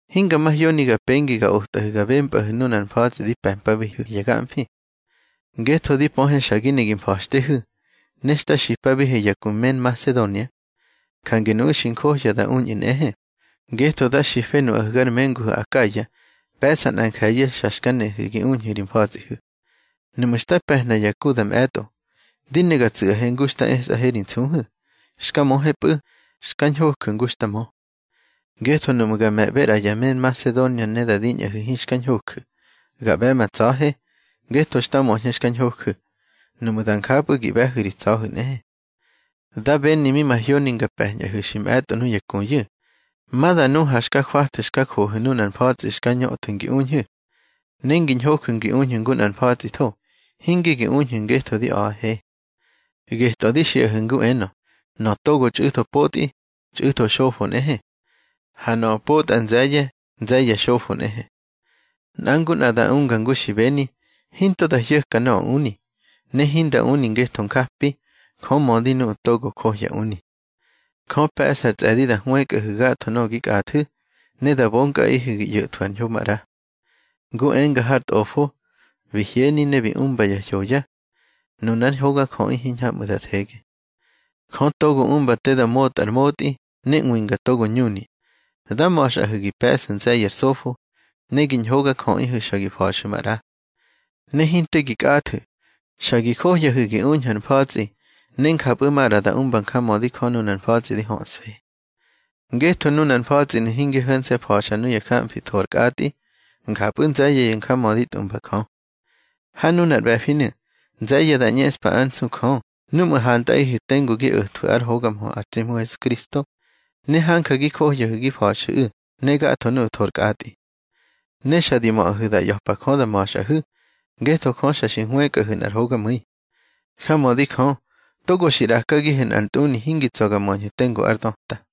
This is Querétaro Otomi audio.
Hinga mahyoni ga pengi ga otꞌahu̱ ga bempꞌahu̱ nunar mfa̱tsꞌi di pe̱mpabihu̱ ya gamfi. Ngetho di pöhe xa gi ne gi mfa̱xtehu̱, ne xta xipabihe ya ku me Nmasedonia. Jange nuꞌu̱ xi njohya da uñꞌu̱ nꞌehe, ngetho da xife nuꞌahu̱ gar menguhu̱ Akaya, pe̱ꞌsa nꞌa nje̱ye̱ xa xka nehu̱ gi uñhu̱ ri mfa̱tsꞌihu̱. Nuꞌmu̱ xta pe̱hna ya ku da mꞌe̱tꞌo, di ne ga tsu̱ꞌahe ngu xta esꞌahe ri nsuhu̱. Xka möhepꞌu̱, xka ñhoju̱ ngu xta mö. Ngetho nuꞌmu̱ ga me̱ꞌbe ꞌra ya me Nmasedonia ne da diñꞌahu̱ hinxka ñhoju̱, ga ꞌbe̱ ma tsa̱he, ngetho xta möñhe xka ñhoju̱. Nuꞌmu̱ da njapꞌu̱ gi ꞌbe̱hu̱ ri tsa̱hu̱ nꞌehe. Da beni mi mahyoni nga pe̱ñꞌahu̱ xi mꞌe̱tꞌo nuya kuyu̱, ma da nu ha xka jwathu̱ xka johu̱ nunar mfa̱tsꞌi xka ñöthu̱ ngi uñhu̱. Ne ngi ñhoju̱ gi uñhu̱ ngu nꞌar mfa̱tsꞌitho, hinge gi uñhu̱ ngetho di a̱ꞌahe. Getꞌö di xiꞌahu̱ ngu enö: Nöꞌö togo txꞌu̱tho potꞌi, txꞌu̱tho xofo nꞌehe. Ha nöꞌö potꞌa nze̱ye̱, nze̱ye̱ xofo nꞌehe. Nꞌa ngu nꞌa da unga ngu xi beni, hinto da hyo̱ka nöꞌö uni, ne hinda uni ngetho njapi. Jö mödi nuꞌu̱ togo johya uni. Jö pe̱ꞌsa ar tsꞌe̱di da hwëkꞌahu̱ gatho nöꞌö gi kꞌathu̱, ne da bonkꞌaꞌihu̱ gi ꞌyo̱thwu̱ ar ñho maꞌra. Ngu enga har Tꞌofo: Bi hyeni ne bi umba ya hyoya. Nunár ñhogajöꞌi hiñhamꞌu̱ da thege. Jö togo umba te da motꞌa ar motꞌi ne ꞌwinga togo ñuni, dá ma̱xꞌahu̱ gi pe̱ꞌsu̱ nze̱ye̱ ar sofo, ne gi ñhogajöꞌihu̱ xa gi fa̱xu̱ maꞌra. Ne hinte gi kꞌathu̱, xa gi johyahu̱ gi uñhu̱ ar mfa̱tsꞌi, ne njapꞌu̱ maꞌra da umba njamödi Jö nunar mfa̱tsꞌi di höꞌsfe. Ngetho nunar mfa̱tsꞌinu̱ hinge ho̱nse̱ fa̱xa nuya gamfi tho ar kꞌatꞌi, njapꞌu̱ nze̱ye̱ ya njamödi tꞌumba Jö. Ha nunar ꞌbe̱finu̱, nze̱ye̱ da ꞌñeꞌspa ár nsu Jö núꞌmu̱ hantꞌaꞌihu̱ tengu gi o̱thwu̱ ár hoga mhö ar tsi Hmu Hesukristo, ne hanja gi johyahu̱ gi fa̱xu̱ꞌu̱ ne gatho nuꞌu̱ tho ar kꞌatꞌi. Ne xa di möꞌahu̱ da ꞌya̱pa Jö da ma̱xꞌahu̱, ngetho Jö xa xi hwëkꞌahu̱ nꞌar hogamu̱i. Jamödi Jö, togo xi ꞌrakagihu̱ nꞌar ntꞌuni hingi tsa̱ ga möñhu̱ tengu ár döta.